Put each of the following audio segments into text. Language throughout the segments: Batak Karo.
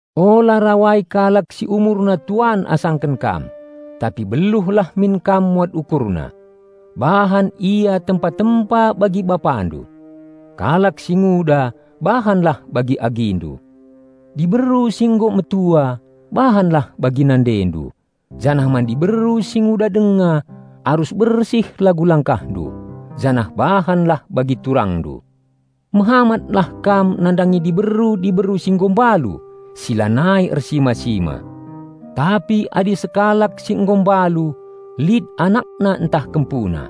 Ula rawai kalak si umurna tuan asangken kam, tapi beluhlah min kam muat ukurna, bahan ia tempa-tempa bagi bapandu. Kalak si nguda bahanlah bagi agindu. Diberu si nggo metua bahanlah bagi nandendu, janah man diberu si nguda denga arus bersih lagu langkahndu, janah bahanlah bagi turangndu. Mehamatlah kam nandangi diberu-diberu si nggo mbalu si lanai ersima-sima. Tapi adi sekalak si nggo mbalu lit anakna ntah kempuna,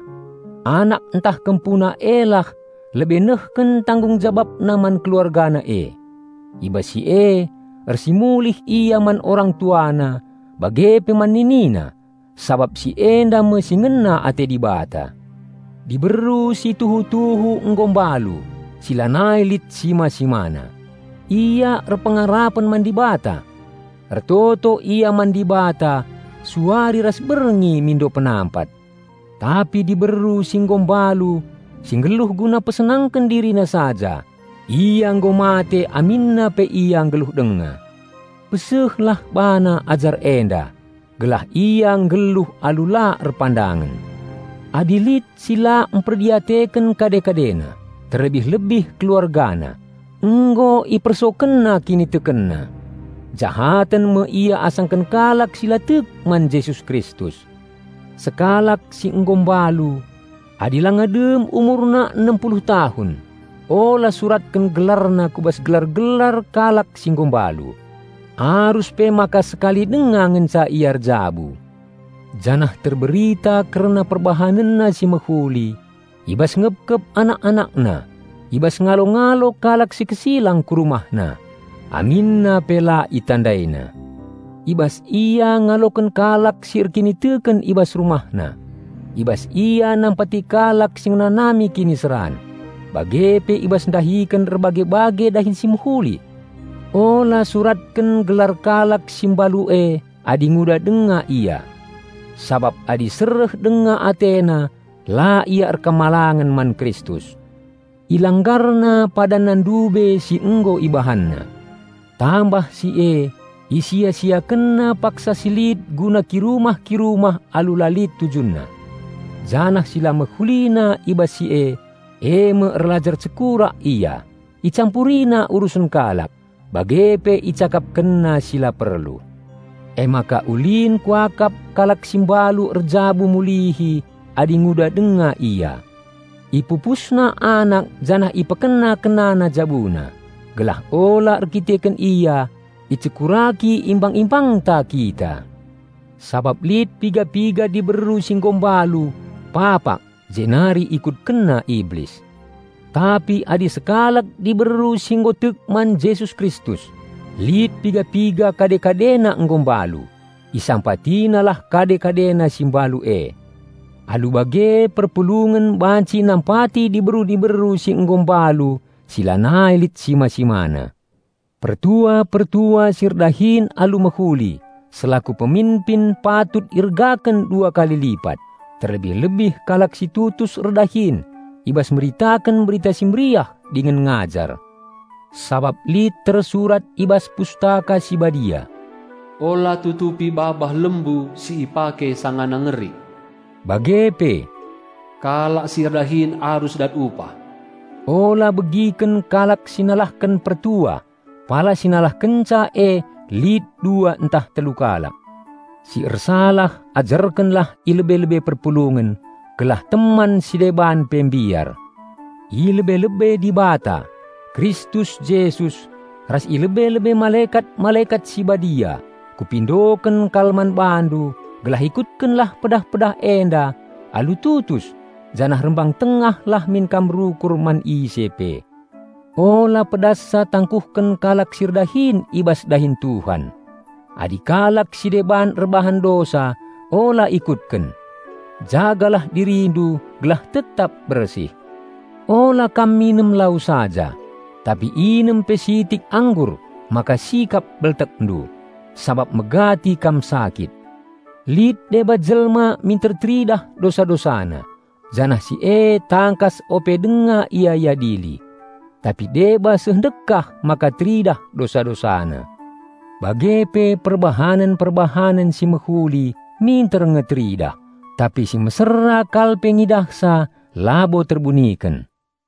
anak ntah kempuna e lah lebe nehken tanggung jababna man keluargana e. I bas si e ersimulih ia man orang-tuana bage pe man ninina, sabap si enda me si ngena ate Dibata. Diberu si tuhu-tuhu nggo mbalu, si lanai lit sima-simana, ia erpengarapen man Dibata. Ertoto ia man Dibata suari ras berngi mindo penampat. Tapi diberu si nggo mbalu si nggeluh guna pesenangken dirina saja, ia nggo mate aminna pe ia nggeluh denga. Pesehlah bana ajar enda gelah ia nggeluh alu la erpandangen. Adi lit si la mperdiateken kade-kadena, terlebih-lebih keluargana, nggo ipersokenna kinitekenna. Jahaten me ia asangken kalak si la tek man Jesus Kristus. Sekalak si nggo mbalu, adi langa dem umurna enem puluh tahun ula suratken gelarna ku bas gelar-gelar kalak si nggo mbalu. Arus pe maka sekali denga ngenca ia erjabu, janah terberita kerna perbahanenna si mehuli: i bas ngepkep anak-anakna, i bas ngalo-ngalo kalak si kesilang ku rumahna, aminna pe la itandaina, i bas ia ngaloken kalak si erkiniteken i bas rumahna, i bas ia nampati kalak si ngenanami kiniseran, bage pe i bas ndahiken erbage-bage dahin si mehuli. Ula suratken gelar kalak si mbalu e adi nguda denga ia. Sabap adi sereh denga atena la ia patuh man Kristus, ilanggarna padanna ndube si nggo ibahanna. Tambah si e, isia-siakenna paksa si lit guna kirumah-kirumah alu la lit tujunna; janah si la mehulina i bas si e, e me erlajar cekurak ia, icampurina urusen kalak, bage pe icakapkenna si la perlu. Emaka ulin kuakap kalak si mbalu erjabu mulihi adi nguda denga ia. Ipupusna anak janah ipekena-kenana jabuna, gelah ula erdandanken ia, icekuraki imbang-imbangta kita. Sabap lit piga-piga diberu si nggo mbalu papak jenari ikutkenna Iblis. Tapi adi sekalak diberu si nggo tek man Jesus Kristus lit piga-piga kade-kadena nggo mbalu, isampatinalah kade-kadena si mbalu e. Alu bage perpulungen banci nampati diberu-diberu si nggo mbalu si lanai lit sima-simana. Pertua-pertua si erdahin alu mehuli selaku peminpin patut iergaken dua kali lipat, terlebih-lebih kalak si tutus erdahin i bas meritaken Berita Si Mehuli dingen ngajar. Sabap lit tersurat i bas Pustaka Si Badia, "Ula tutupi babah lembu si ipake sangana ngerik," bage pe, "kalak si erdahin arus dat upah." Ula begiken kalak si nalahken pertua, pala si nalahkenca e lit dua ntah telu kalak. Si ersalah ajarkenlah i lebe-lebe perpulungen gelah teman si deban pe mbiar. I lebe-lebe Dibata, Kristus Jesus, ras i lebe-lebe malekat-malekat si badia kupindoken kal man bandu gelah ikutkenlah pedah-pedah enda alu tutus janah rembang-tengahlah min kam rukur man ise pe. Ula pedassa tangkuhken kalak si erdahin i bas dahin Tuhan. Adi kalak si deban erbahan dosa ula ikutken. Jagalah dirindu gelah tetap bersih. Ula kam minem lau saja, tapi inem pe sitik anggur maka sikap beltekndu, sabap megati kam sakit. Lit deba jelma minter teridah dosa-dosana, janah si e tangkas ope denga ia iadili. Tapi deba seh ndekah maka teridah dosa-dosana. Bage pe perbahanen-perbahanen si mehuli minter nge teridah, tapi si mesera kal pe ngidahsa labo terbuniken.